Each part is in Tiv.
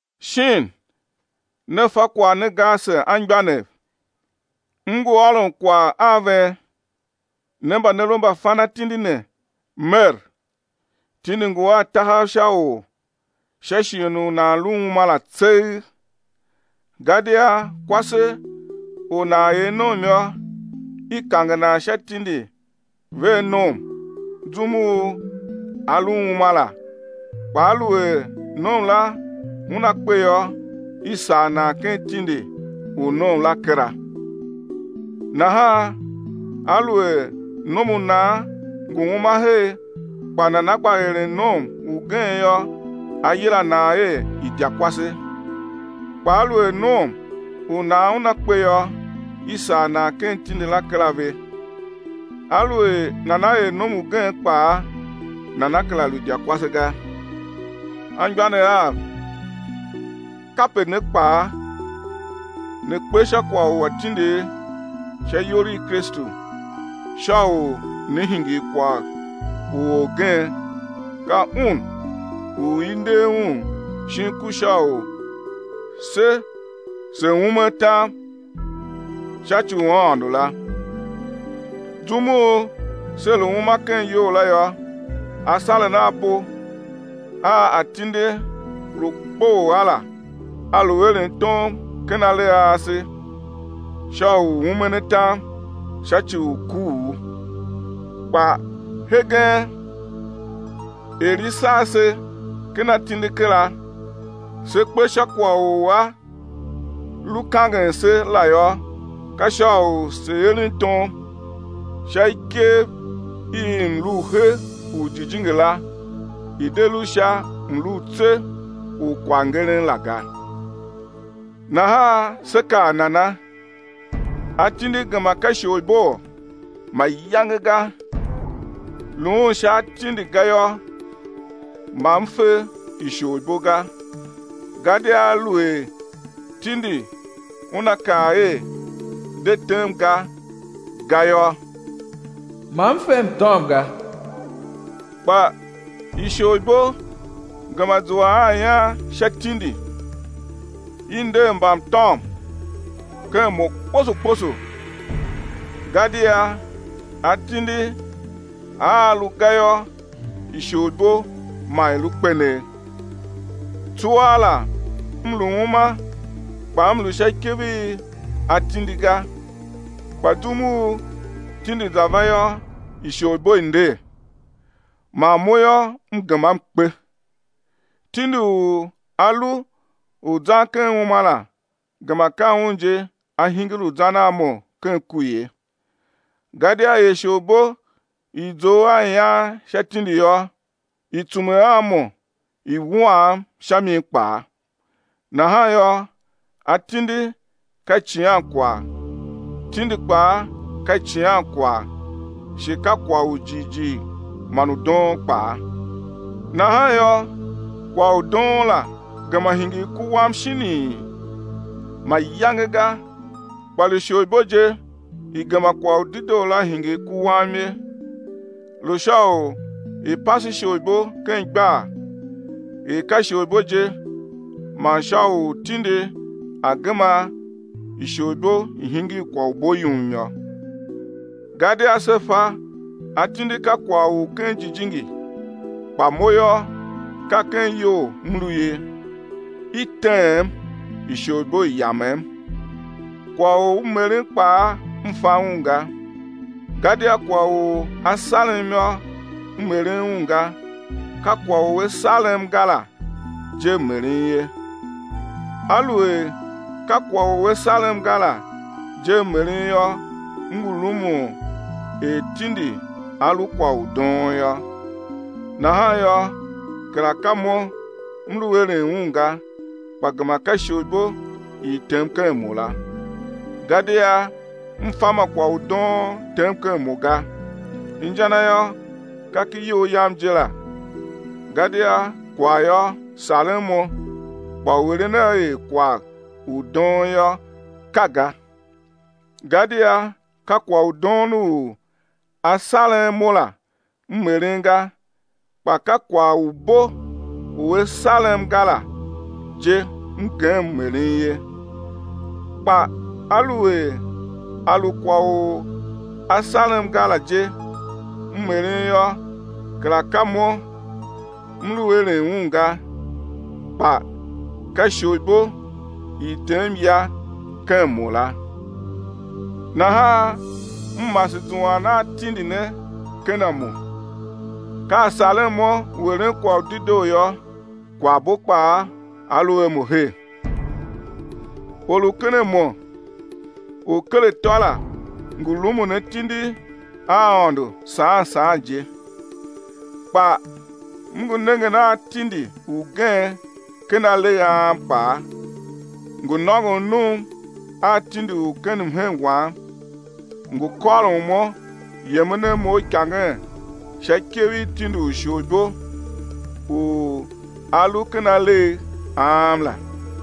Shin ne fa kwagh ne ga ase anmgbianev, m ngu ôron kwagh a ven, ne mba ne lu mbafanatindi ne mer, tindi ngu a tahav sha or sha shighe u nan lu uma la tseegh. Gadia kwase u nan er nom yô, i kange nan sha tindi vea nom zum u a lu uma la, kpa aluer nom la una kpe yô, i sagh nan ken tindi u nom la kera. Nahan aluer nom u nan ngu uma her kpa nana gba eren nom ugen yô, á yila nan er idyakwase. Kpa aluer nom u nan una kpe yô, i sagh nan ken tindi la kera ve. Aluer nana er nom ugen kpaa, nana kera lu idyakwase ga. Anmgbianev av, kape ne kpaa, ne kpe sha kwagh u atindigh sha iyol i Kristu, sha u né hingir kwagh u orgen, ka Un u i nder Un shin ku sha u se se̱ ume atam sha ci u Aôndo la. Zum u se lu uma ken iyol la yô, asaren a bo a atindi lu kpoghol a la, a lu eren tom ken alegh a ase sha u umen atam sha ci u kuugh. Kpa hegen er i sagh se ken atindi kera, se kpe sha kwagh u a lu kangen se la yô, ka sha u se̱ eren tom sha ikev i mlu u he u jijingi la i̱ de lu sha mlu u tse u kwaghngeren la ga. Nahan sé kaa nana? Atindi gema ka isholiboo? Mayange ga. Luun sha atindi ga yô, ma m fe isholibo ga, gadia aluer tindi una kaa er, de tem ga, ga yô, ma m fe mtôm ga. Kpa isholibo gema zua a ian sha tindi, i nder mbamtôm ken mo kposo kposo. Gadia atindi aa lu ga yô, isholibo ma i lu kpenegh. Tsuaa la m lu uma kpa m lu sha ikev i atindi ga. Kpa zum u tindi za va yô, isholibo i nder, man mo yô, m gema m kpe. Tindi u a lu u zan ken uma la gema ka un je a hingir u zan a mo ken ku ye. Gadia er isholibo i zough a ian sha tindi yô, i tsume a mo i wuam sha mi kpaa. Nahan yô, atindi ka icighankwagh, tindi kpaa ka icighankwagh shi kwagh u jighjigh man u doon kpaa. Nahan yô, kwagh u doon la gema hingir ku wam shinii? Mayange ga. Kpa lu isholibo je i gema kwagh u dedoo la hingir ku wam ye, lu sha u i̱ pase isholibo ken igbar er ka isholibo je man sha u tindi a̱ gema isholibo i̱ hingir kwagh u bo yum yô. Gadia se fa atindi ka kwagh u ken jijingi, kpa mo yô, ka ken iyol m lu ye, i teem, isholibo i yamem. Kwagh u m eren kpaa m fa un ga, gadia kwagh u a sarem yô, m eren un ga, ka kwagh u a sarem ga la je m eren ye. Aluer ka kwagh u a sarem ga la je m eren yô, m ngu rumun er tindi a lu kwagh u doon yô. Nahan yô, kera ka mo m lu eren un ga, kpa gema ka isholibo i i tem ken mo la. Gadia m fa ma kwagh u doon tem ken mo ga, inja na yô, ka ken iyol yam je la, gadia kwagh yô, saren mo kpa u eren a er kwagh u doon yô, ka ga. Gadia ka kwagh u doon u a saren mo la, m eren ga, kpa ka kwagh u bo u a sarem ga la je m gem m eren ye. Kpa aluer a lu kwagh u a sarem ga la je m eren yô, kera ka mo m lu eren un ga, kpa ka isholibo i i tem ya ken mo la. Nahan m mase zuan a tindi ne ken a mo: Ka a saren mo u eren kwagh u dedoo yô, kwaghbo kpaa a lu a mo her. Or u ken a mo u ker atô la ngu rumun atindi a Aôndo saan saan je. Kpa m ngu nengen a tindi ugen ken alegh a am kpaa, ngu nôngon num a tindi u ken mhen wam, ngu kôron mo yemen a mo uikangen sha ikev i tindi u isholibo u a lu ken alegh a am la.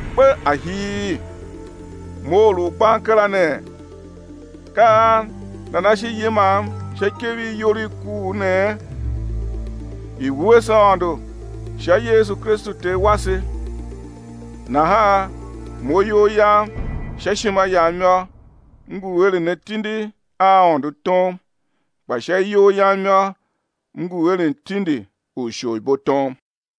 Kpe ahii, mo or u gban kera ne! Ka an nana shi yimam sha ikev i iyol i kuugh nee? I̱ wuese Aôndo sha Yesu Kristu Ter wase! Nahan mo iyol yam sha ishima yam yô, m ngu eren atindi a Aôndo tom, kpa sha iyol yam yô, m ngu eren tindi u isholibo tom.